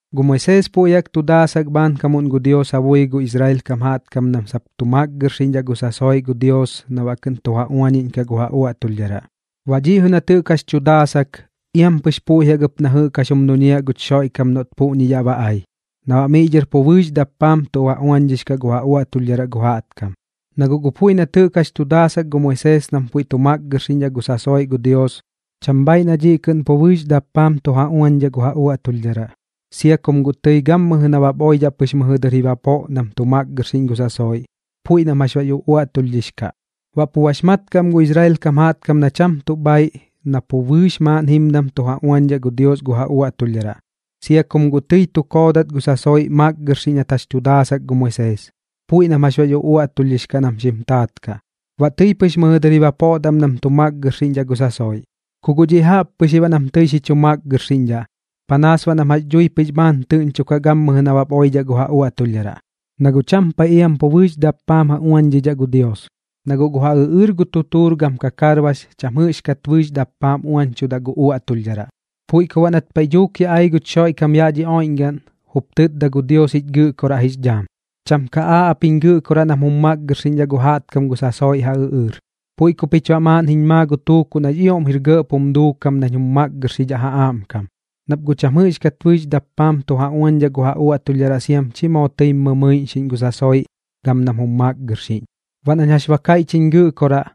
Gu Moisees puiꞌ jaꞌk tu daasak bhaankamuꞌn gu Dios ja bui gu Israel kam jaꞌtkam nam sap tu makgɨrxiꞌñdhaꞌ gu sasoiꞌ gu Dios na baꞌ kɨꞌn tu ja uañiꞌñkaꞌ gu ja uaꞌtulhdharaꞌ. Baꞌ dhiꞌ jɨꞌ nat jɨꞌk jax tu daasak, iam pɨx puiꞌ jaꞌk ɨp na jɨꞌk jax jum duñiaꞌ guch Xoiꞌkam noꞌt puꞌñi yaꞌ ba ai, na baꞌ miꞌ dhɨr pu bɨɨx dappaam tu ja uañdhix kaꞌ gu ja uaꞌtulhdharaꞌ gu jaꞌtkam. Na guꞌ gu puiꞌ nat jɨꞌk jax tu daasak gu Moisees nam puiꞌ tu makgɨrxiꞌñdhaꞌ gu sasoiꞌ gu Dios, cham bhaaiꞌ na dhiꞌ kɨꞌn pu bɨɨx dappaam tu ja uañdhaꞌ gu ja uaꞌtulhdharaꞌ, sia kum guꞌ tɨi gammɨjɨ nabap oidhaꞌ pɨx mɨjɨ dɨr ji bapoꞌ nam tu makgɨrxiꞌñ gu sasoiꞌ, puiꞌ nam jax bax uꞌuaꞌtulhdhix kaꞌ. Baꞌ pux mat kaꞌ am gu Israel kam jaꞌtkam na cham tuꞌ bhaaiꞌ na pu bɨɨx maaꞌn jimdam tu ja uañdhaꞌ gu Dios gu ja uaꞌtulhdharaꞌ, sia kum guꞌ tɨi tu koodat gu sasoiꞌ makgɨrxiꞌñ nat jax tu daasak gu Moisees, puiꞌ nam jax bax uꞌuaꞌtulhdhix kaꞌ nam xim taat kaꞌ. Baꞌ tɨi pɨx mɨjɨ dɨr ji bapoꞌdaꞌ am nam tu makgɨrxiꞌñdhaꞌ gu sasoiꞌ. Ku guꞌ dhiꞌ pu jaꞌp pɨx ji baꞌ nam tɨi xi chu makgɨrxiꞌñdhaꞌ, panaas baꞌ nam jax dhui pɨx bhaan tɨꞌñchokaꞌ gammɨjɨ nabap oidhaꞌ gu ja uaꞌtulhdharaꞌ, na guꞌ cham paiꞌ iam pu bɨɨx dappaam ja uañdhidhaꞌ gu Dios, na guꞌ gu ja ɨꞌɨɨr gu tutuur gam kakarbax cham jɨꞌxkat bɨɨx dappaam uañchudaꞌ gu uaꞌtulhdharaꞌ. Puiꞌ ku baꞌ nat paiꞌ dhuuk yaꞌ ai guch Xoiꞌkam yaꞌ dhi oiꞌñgaꞌn, jup tɨtda gu Dios jich Gɨꞌkoraꞌ jix dhaam: Cham ka aaꞌ ap jiñ Gɨꞌkoraꞌ nam jum makgɨrxiꞌñdhaꞌ gu jaꞌtkam gu sasoiꞌ ja ɨꞌɨɨr, puiꞌ ku pich baꞌ maaꞌn jiñ maa gu tuukuꞌ nax ioꞌm jir gɇꞌp jum duukam nañ jum makgɨrxidhaꞌ ja aꞌmkam. Nap guꞌ cham jɨꞌxdhat bɨɨx dappaam tu ja uañdhaꞌ gu ja uaꞌtulhdharaꞌ siam chi moo tɨim mɨmɨiꞌñxiꞌñ gu sasoiꞌ gam nam jum makgɨrxiꞌñ. Baꞌ nañ jax ba kaiꞌch jiñ Gɨꞌkoraꞌ,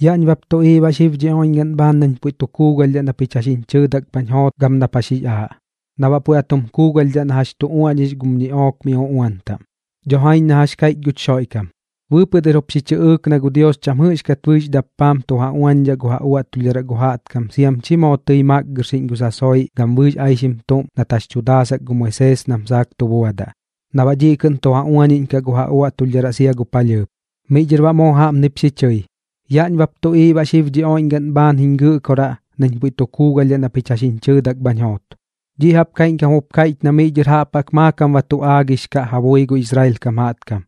yaꞌñ bap tuꞌiiꞌ baꞌ xib dhi oiꞌñgaꞌn bhaan nañ puiꞌ tu kuugalhdhaꞌ na pich jax jiñ chɨɨdak bhañ joot gam nap jax jix aaꞌ, na baꞌ puiꞌ ba tum kuugalhdhaꞌ na jax tu uaꞌñix gum ñiꞌook mi uꞌuan taꞌm. Dho jaiñ na jax kaiꞌch guch Xoiꞌkam. Bɨɨpɨꞌ dɨr jup xi chɨꞌɨɨk na gu Dios cham jɨꞌxdhaꞌ bɨɨx dappaam tu ja uañdhaꞌ gu ja uaꞌtulhdharaꞌ gu jaꞌtkam siam chi moo tɨi makgɨrxiꞌñ gu sasoiꞌ gam bɨɨx aixim tuꞌm nat jax tu daasak gu Moisees nam saak tu buadaꞌ, na baꞌ dhiꞌ kɨꞌn tu ja uañiꞌñkaꞌ gu ja uaꞌtulhdharaꞌ sia gu palhɨɨp. Miꞌ dhɨr baꞌ moo jaꞌpnip xi chɨi: “Yaꞌñ bap tuꞌiiꞌ baꞌ xib dhi oiꞌñgaꞌn bhaan jiñ Gɨꞌkoraꞌ nañ puiꞌ tu kuugalhdhaꞌ na pich jɨꞌk jax jiñ chɨɨdak bhañ joot.” Dhiꞌ jaꞌp kaiꞌñkam jup kaiꞌch na miꞌ dhɨr jaꞌp jaꞌk maakam ba tu aagix kaꞌ ja bui gu Israel kam jaꞌtkam,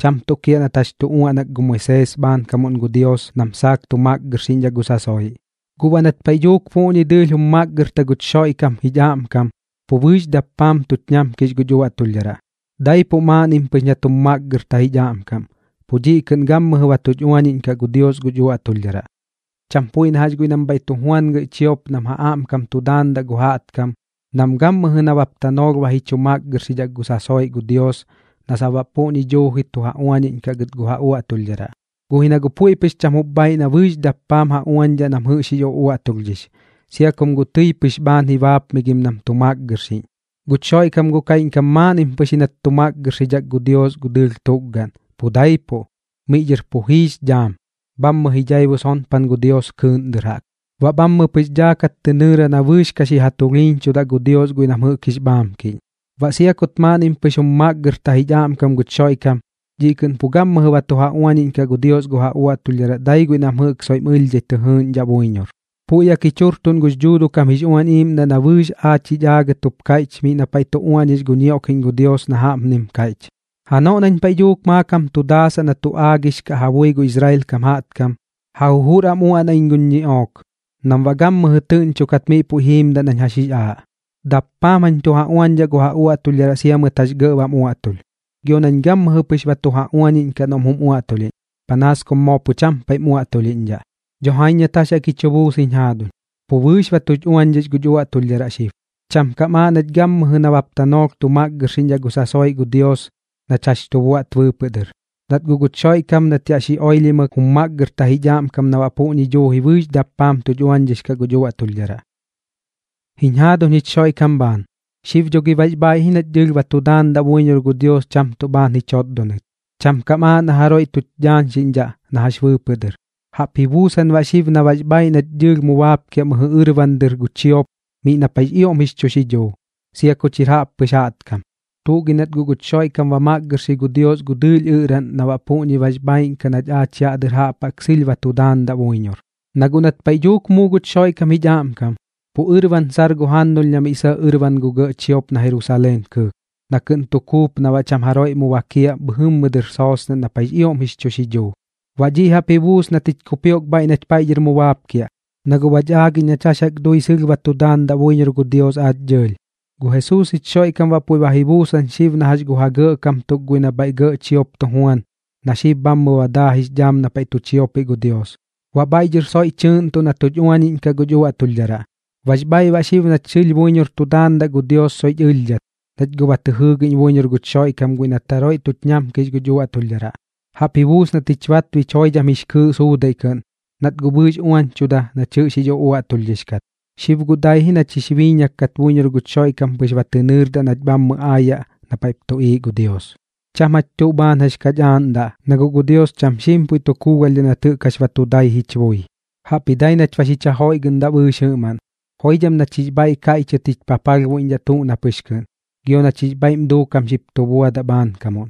cham tuꞌ kiaꞌ nat jax tu uaꞌnak gu Moisees bhaankamuꞌn gu Dios nam saak tu makgɨrxiꞌñdhaꞌ gu sasoiꞌ. Guꞌ baꞌ nat paiꞌ dhuuk puꞌñi dɨɨlh jum makgɨrta guch Xoiꞌkam jich aꞌmkam, pu bɨɨx dappaam tuch ñamkix guch uaꞌtulhdharaꞌ. Daipuꞌ maaꞌnnim pɨx nat jum makgɨrta jich aꞌmkam, pu dhiꞌ kɨꞌn gammɨjɨ ba tuch uañiꞌñkaꞌ gu Dios guch uaꞌtulhdharaꞌ. Cham puiꞌ na jax guiꞌ nam bhaiꞌ tu juan gɇꞌ chiop nam ja aꞌmkam tu daandaꞌ gu jaꞌtkam, nam gammɨjɨ nabap tanoolh ba ji chu makgɨrxidhaꞌ gu sasoiꞌ gu Dios na sap baꞌ puꞌñi duuji tu ja uañiꞌñkaꞌ gɨt gu ja uaꞌtulhdharaꞌ. Guꞌ ji na guꞌ puiꞌ pɨx cham jup bhaaiꞌ na bɨɨx dappaam ja uañdhaꞌ nam jɨꞌx jix uꞌuaꞌtulhdhix, sia kum guꞌ tɨi pɨx bhaan ji baapmigim nam tu makgɨrxiꞌñ. Guch Xoiꞌkam guꞌ kaiꞌñkam maaꞌnnim pɨx ji nat xi makgɨrxidhak gu Dios gu dɨɨlh tukgaꞌn, pu daipuꞌ. Miꞌ dhɨr pu jiix dhaam, bhammɨ ji dhaibu sonpan gu Dios kɨɨꞌn dɨr jaꞌk. Baꞌ bhammɨ pɨx dhaakat tɨ nɨɨra na bɨɨx ka xi ja tulhiiñchudaꞌ gu Dios guiꞌ nam jɨꞌk jix bhaamkiꞌñ. Baꞌ sia kut maaꞌnnim pɨx jum makgɨrta jich aꞌmkam guch Xoiꞌkam, dhiꞌ kɨꞌn pu gammɨjɨ ba tu ja uañiꞌñkaꞌ gu Dios gu ja uaꞌtulhdharaꞌ dai guiꞌ nam jɨꞌk soiꞌm ɨlhdhai tɨ jɨɨꞌñdhaꞌ buiñor. Puiꞌ jaꞌk jich jurtuꞌn gux Dhuuduꞌ kam jix Uañ Iiꞌmdaꞌ na bɨɨx aach jich aagɨt jup kaiꞌch miꞌ na paiꞌ tu uaꞌñix gu ñioꞌkiꞌñ gu Dios na jaꞌpnim kaiꞌch: Janoꞌ nañ paiꞌ dhuuk maakam tu daasaꞌ na tu aagix kaꞌ ja bui gu Israel kam jaꞌtkam, ja jujur am jañ uaꞌnaꞌ guñ ñiꞌook, nam baꞌ gammɨjɨ tɨꞌñchokat miꞌ puiꞌ jiimdaꞌ nañ jax jix aaꞌ. Dappaam jañ tu ja uañdhaꞌ gu ja uaꞌtulhdharaꞌ sia mɨt jax gɇꞌ bam uaꞌtulh, gio nañ gammɨjɨ pɨx ba tu ja uañiꞌñkaꞌ noꞌm jum uaꞌtulhiꞌñ, panaas kum moo pu cham paiꞌm uaꞌtulhiꞌñdhaꞌ. Dho jaiñ nat jax jaꞌk ji chu buus jiñ jaaduñ, pu bɨɨx ba tuch uañdhix guch uaꞌtulhdharaꞌ xib. Cham kam aaꞌ nach gammɨjɨ nabap tanoolh tu makgɨrxiꞌñdhaꞌ gu sasoiꞌ gu Dios nach jax tu buaꞌt bɨɨpɨꞌ dɨr, nat guꞌ guch Xoiꞌkam na jax yaꞌ xi oilhimɨk jum makgɨrta jich aꞌmkam na baꞌ puꞌñi duuji bɨɨx dappaam tuch uañdhix kaꞌ guch uaꞌtulhdharaꞌ. Jiñ jaaduñ jich Xoiꞌkam bhaan, xib dho gi bax bhaaiꞌ ji nach dɨɨlh ba tu daandaꞌ buiñor gu Dios cham tuꞌ bhaan ji chotdonɨt, cham kam aaꞌ na jaroiꞌ tuch dhaañxiꞌñdhaꞌ na jax bɨɨpɨꞌ dɨr. Jaꞌp ji buusan baꞌ xib na bax bhaaiꞌ nach dɨɨlh mu baapkiaꞌ mɨjɨ ɨrban dɨr gu chiop miꞌ na paiꞌx ioꞌm jix chu xidhuu, sia kuch jir jaꞌppɨx jaꞌtkam. Tuꞌ gi nat guꞌ guch Xoiꞌkam ba makgɨrxi gu Dios gu dɨɨlh ɨꞌraꞌn na baꞌ puꞌñi bax bhaaiꞌn kaꞌ nach yaꞌ dɨr jaꞌp jaꞌk sɨlh ba tu daandaꞌ buiñor. Na guꞌ nat paiꞌ dhuuk muu guch Xoiꞌkam jich aꞌmkam, pu ɨrban sar gu jannulh na miꞌ sɇꞌ ɨrban gu gɇꞌ chiop na Jerusaleen kɨɨk, na kɨꞌn tu kuup na baꞌ cham jaroiꞌ mu bakiaꞌ bhɨjɨmmɨ dɨr soosnaꞌn na paiꞌx ioꞌm jix chu xidhuu. Baꞌ dhiꞌ jaꞌp ji buus nat jich kupioꞌk bhaiꞌ nach paiꞌ dhɨr mu baapkiaꞌ, na guꞌ bach aagiꞌñ nach jax jaꞌk dui sɨlh ba tu daandaꞌ buiñor gu Dios aach dɨɨlh. Gu Jesuus jich Xoiꞌkam baꞌ puiꞌ ba ji buusan xib na jax gu ja gɇꞌkam tuk guiꞌ nam bhaiꞌ gɇꞌ chiop tu juan, na xib bhammɨ ba daa jix dhaam na paiꞌ tu chiopiꞌ gu Dios, baꞌ bhaiꞌ dhɨr soiꞌ tɨɨꞌntuꞌ na tuch uañiꞌñkaꞌ guch uaꞌtulhdharaꞌ. Bax bhaaiꞌ baꞌ xib nach sɨlh buiñor tu daandaꞌ gu Dios soiꞌch ɨlhdhat, nach guꞌ ba tɨ jɨɨgiꞌñ buiñor guch Xoiꞌkam guiꞌ nat jaroiꞌ tuch ñamkix guch uaꞌtulhdharaꞌ. Jaꞌp ji buus nat jich batbich joidham jix kɨɨꞌ suudaiꞌ kɨꞌn, nat guꞌ bɨɨx uañchuda nach jɨꞌx jix uꞌuaꞌtulhdhix kat. Xib guꞌ dai ji nach jix biiñak kat buiñor guch Xoiꞌkam pɨx ba tɨ nɨɨrdaꞌ nach bhammɨ aayaꞌ na paiꞌp tuꞌiiꞌ gu Dios. Cham jach tuꞌ bhaan jax kach aaꞌndaꞌ, na guꞌ gu Dios cham xiim puiꞌ tu kuugalhdhaꞌ nat jɨꞌk jax ba tu dai jich bui. Jaꞌpji dai ji nach ba xich ja joiꞌgɨꞌndaꞌ bɨɨx jɨꞌmaꞌn, joidham nach jix bhaiꞌ kaiꞌchɨt jich papalhbuiꞌñdhaꞌ tuꞌ na pɨx kɨꞌn, gio nach jix bhaiꞌm duukam xip tu buadaꞌ bhaankamuꞌn.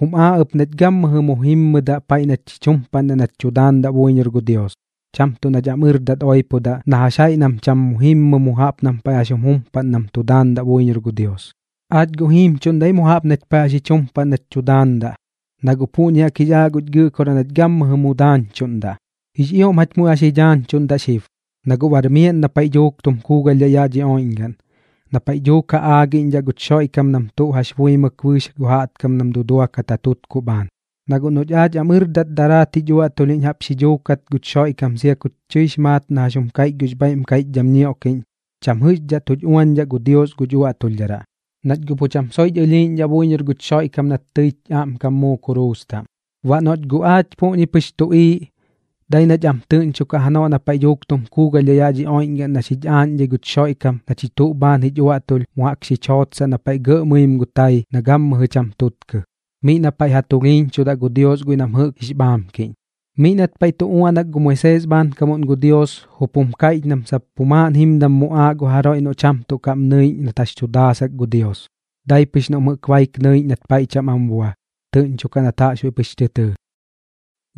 Jum aaꞌ ɨp nach gammɨjɨ mu jimmɨdaꞌ paiꞌ nach jich jumpaꞌndaꞌ nach tu daandaꞌ buiñor gu Dios, cham tuꞌ nach am ɨrdat oipodaꞌ na jax jaiꞌ nam pu cham jimmɨ mu jaꞌp nam paiꞌ jax jum jumpaꞌn nam tu daandaꞌ buiñor gu Dios. Aach guꞌ jiimchuꞌndaꞌ ji mu jaꞌp nach paiꞌ jax jich jumpaꞌndaꞌ nach tu daandaꞌ, na guꞌ puꞌñi jaꞌk jix aaꞌ guch Gɨꞌkoraꞌ nach gammɨjɨ mu daañchuꞌndaꞌ. Jix ioꞌm jach muiꞌ ba xi dhaañchuꞌndaꞌ xib, na guꞌ bar miaꞌn na paiꞌ dhuuk tum kuugalhdhaꞌ yaꞌ dhi oiꞌñgaꞌn, na paiꞌ dhuuk ja aagiꞌñdhaꞌ guch Xoiꞌkam nam tuꞌ jax buimɨk bɨɨx gu jaꞌtkam nam duduakat ja tutkuꞌ bhaan. Na guꞌ noꞌch aach am ɨrdat daraat jich uaꞌtulhiꞌñ jaꞌp xi dhuukat guch Xoiꞌkam sia kuch tɨix maat na jax jum kaiꞌch gux bhaiꞌm kaiꞌchdham ñioꞌkiꞌñ, cham jɨꞌxdhaꞌ tuch uañdhaꞌ gu Dios guch uaꞌtulhdharaꞌ, nach guꞌ pu cham soiꞌch ɨlhiiꞌñdhaꞌ buiñor guch Xoiꞌkam nat tɨich aꞌmkam muu kuruus taꞌm. Baꞌ noꞌch guꞌ aach puꞌñi pɨx tuꞌiiꞌ, dai nach am tɨꞌñchokaꞌ janoꞌ na paiꞌ dhuuk tum kuugalhdhaꞌ yaꞌ dhi oiꞌñgaꞌn na xich aaꞌñdhai guch Xoiꞌkam na chich tuꞌ bhaan jich uaꞌtulh mu jaꞌk xich jootsaꞌ na paiꞌ gɇꞌ mɨim gu tai na gammɨjɨ cham tuꞌtkɨ, miꞌ na paiꞌ ja tulhiiñchudaꞌ gu Dios guiꞌ nam jɨꞌk jix bhaamkiꞌñ. Miꞌ nat paiꞌ tu uaꞌnak gu Moisees bhaankamuꞌn gu Dios, jup jum kaiꞌch nam sap pu maaꞌn jimdam muꞌaaꞌ gu jaroiꞌ noꞌ cham tuꞌ kaꞌm nɨiꞌñ nat jax tu daasak gu Dios, dai pɨx noꞌm jɨꞌk baik nɨiꞌñ nat paiꞌ cham am bua, tɨꞌñchokaꞌ nat jaꞌxbuiꞌ pɨx tɨ tɨɨ.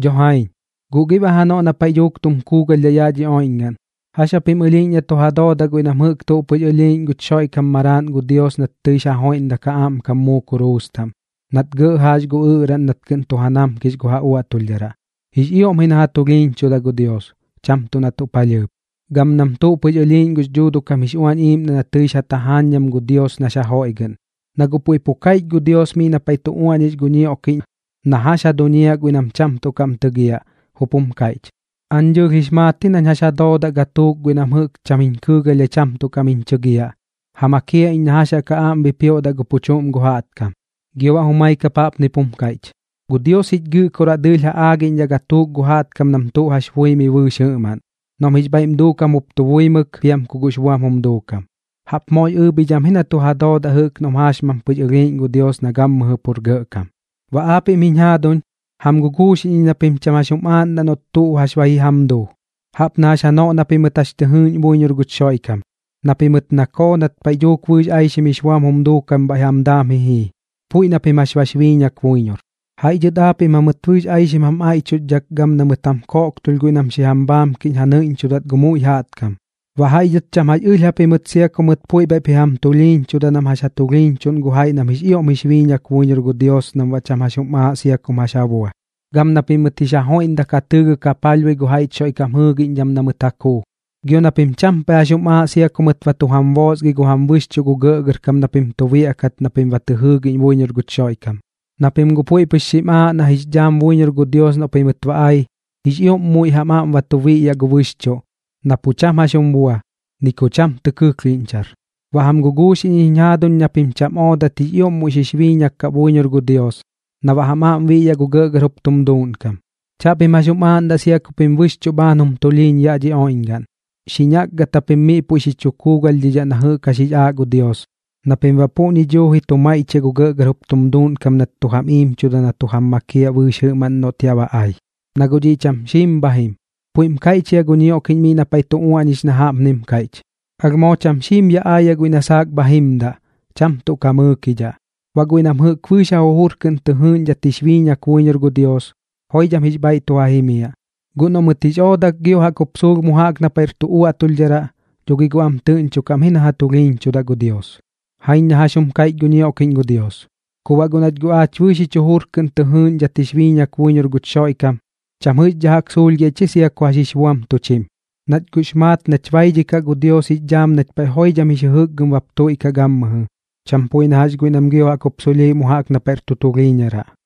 Dho jaiñ, ¿guꞌ gi baꞌ janoꞌ na paiꞌ dhuuk tum kuugalhdhaꞌ yaꞌ dhi oiꞌñgaꞌn, jax japim ɨlhiiꞌñ na tu ja doodaꞌ guiꞌ nam jɨꞌk tuꞌ pɨx ɨlhiiꞌñ guch Xoiꞌkam Maraaꞌn gu Dios nat tɨix ja joiꞌndak ja aꞌmkam muu kuruus taꞌm, nat gɇꞌ jaax gu ɨꞌraꞌn nat kɨꞌn tu ja namkix gu ja uaꞌtulhdharaꞌ? Jix ioꞌm ji na ja tulhiiñchudaꞌ gu Dios, cham tuꞌ na tuꞌ palhɨɨp, gam nam guꞌ tuꞌ pɨx ɨlhiiꞌñ gux Dhuuduꞌ kam jix Uañ Iiꞌmdaꞌ na tɨix ja tajaañdham gu Dios nax ja joiꞌgɨꞌn. Na guꞌ puiꞌ pu kaiꞌch gu Dios miꞌ na paiꞌ tu uaꞌñix gu ñioꞌkiꞌñ na jax ja duñiaꞌ guiꞌ nam cham tuꞌ kaꞌm tɨgiaꞌ, jup jum kaiꞌch: “Aañ dɨɨlh jix maat ji nañ jax ja doodaꞌ gatuuk guiꞌ nam jɨꞌk cham jiñ kɨɨgalhdhai cham tuꞌ kaꞌm jiñ chɨgiaꞌ. Ja makiaꞌ iñ na jax jaꞌk ja aꞌm bipioꞌdaꞌ gu pu chuꞌm gu jaꞌtkam.” Gio baꞌ jumai kap jaꞌpnip jum kaiꞌch: “Gu Dios jich Gɨꞌkoraꞌ dɨɨlh ja aagiꞌñdhaꞌ gatuuk gu jaꞌtkam nam tuꞌ jax buimɨi bɨɨx jɨꞌmaꞌn, noꞌm jix bhaiꞌm duukam jup tu buimɨk piam ku guꞌx buam jum duukam.” ¡Jaꞌp moox ɨɨbhidham ji na tu ja doodaꞌ jɨꞌk noꞌm jaaxmam pɨx ɨlhiiꞌñ gu Dios na gammɨjɨ pur gɇꞌkam! Baꞌ aapiꞌm jiñ jaaduñ, jam guguuxiꞌñ iñ na pim cham jax jum aaꞌndaꞌ noꞌt tuꞌ jax ba ji jam duu, jaꞌp na jax janoꞌ na pimɨt jax tɨ jɨɨꞌñ buiñor guch Xoiꞌkam, na pimɨt nakoo nat paiꞌ dhuuk bɨɨx aixim jix buam jum duukam bhaiꞌ jam daam ji jii, puiꞌ na pim jax bax biiñak buiñor. Jaiꞌ dhɨt aapiꞌm jamɨt bɨɨx aixim jam aiꞌchuxdhak gam na mɨt jam koꞌktulh guiꞌ nam xi jam bhaamkiꞌñ ja nɨiꞌñchudat gu muiꞌ jaꞌtkam. Baꞌ jaiꞌ dhɨt cham jax ɨlh japimɨt sia ku mɨt tɨi puiꞌ bhaiꞌp ji jam tulhiiñchuda nam jax ja tulhiiñchuꞌn gu jaiꞌ nam jix ioꞌm jix biiñak buiñor gu Dios nam baꞌ cham jax jum aaꞌ sia kum jax ja bua. Gam na pimɨt jix ja joiꞌndak ja tɨɨgɨk ja palhbui gu jaiꞌch Xoiꞌkam jɨɨgiꞌñdham na mɨt ja kuu, gio na pim cham paiꞌ jax jum aaꞌ sia ku mɨt ba tu jam boosgi gu jam bɨxchuꞌ gu gɇꞌgɇrkam na pim tu biaꞌkat na pim ba tɨ jɨɨgiꞌñ buiñor guch Xoiꞌkam, na pim guꞌ puiꞌ pɨx xim aaꞌ nax dhaam buiñor gu Dios noꞌ pimɨt ba ai, jix ioꞌm muiꞌ jam aꞌm tu biꞌyaꞌ gu bɨxchuꞌ, na pu cham tuꞌ jax jum bua, ni ku cham tɨ kɨklhiꞌñchar. Baꞌ jam guguuxiꞌñ iñ jiñ jaaduñ na pim cham oodat jix ioꞌm muiꞌ xix biiñak kaꞌ buiñor gu Dios, na baꞌ jam aꞌm biꞌyaꞌ gu gɇꞌgɇr jup tum duuꞌnkam. Chaꞌpim jax jum aaꞌndaꞌ sia ku pim bɨxchuꞌ bhaan jum tulhiiñ yaꞌ dhi oiꞌñgaꞌn. Xi ñakgat japim miꞌ puiꞌ xi chu kuugalhdhidhaꞌ na jɨꞌk jax jix aaꞌ gu Dios, na pim baꞌ puꞌñi duuji tu maiꞌchiaꞌ gu gɇꞌgɇr jup tum duuꞌnkam nat tu jam iimchuda na tu jam makiaꞌ bɨɨx jɨꞌmaꞌn noꞌt yaꞌ ba ai, na guꞌ dhiꞌ cham xiim bha jim. Puiꞌm kaiꞌch jia gu ñioꞌkiꞌñ miꞌ na paiꞌ tu uaꞌñix na jaꞌpnim kaiꞌch: Alh moo cham xiim yaꞌ aayaꞌ guiꞌ na saak bha jimdaꞌ, cham tuꞌ ka mɨɨkidhaꞌ. Baꞌ guiꞌ nam jɨꞌk bɨɨx ja jujur kɨꞌn tɨ jɨɨꞌñdhat jix biiñak buiñor gu Dios, joidham jix bhaiꞌ tu ja jimiaꞌ. Guꞌ noꞌ mɨt jix oodak gio jaꞌk jup suulh mu jaꞌk na paiꞌr tu uaꞌtulhdharaꞌ, dho gi guꞌ am tɨꞌñchokaꞌ am ji na ja tulhiiñchudaꞌ gu Dios. Jaiñ na jax jum kaiꞌch gu ñioꞌkiꞌñ gu Dios. Ku baꞌ guꞌ nach guꞌ aach bɨɨx jich jujur kɨꞌn tɨ jɨɨꞌñdhat jix biiñak buiñor guch Xoiꞌkam, cham jɨꞌxdhaꞌ jaꞌk suulhgiaꞌ ich sia ku jax jix buam tuch jim, nach guꞌx maat nach baidhikaꞌ gu Dios jix dhaam nach paiꞌ joidham jix jɨjɨkgɨm bap tuiꞌkaꞌ gammɨjɨ, cham puiꞌ na jax guiꞌ nam gio jaꞌk jup suulhiꞌ mu jaꞌk na paiꞌr tu tulhiiñaraꞌ.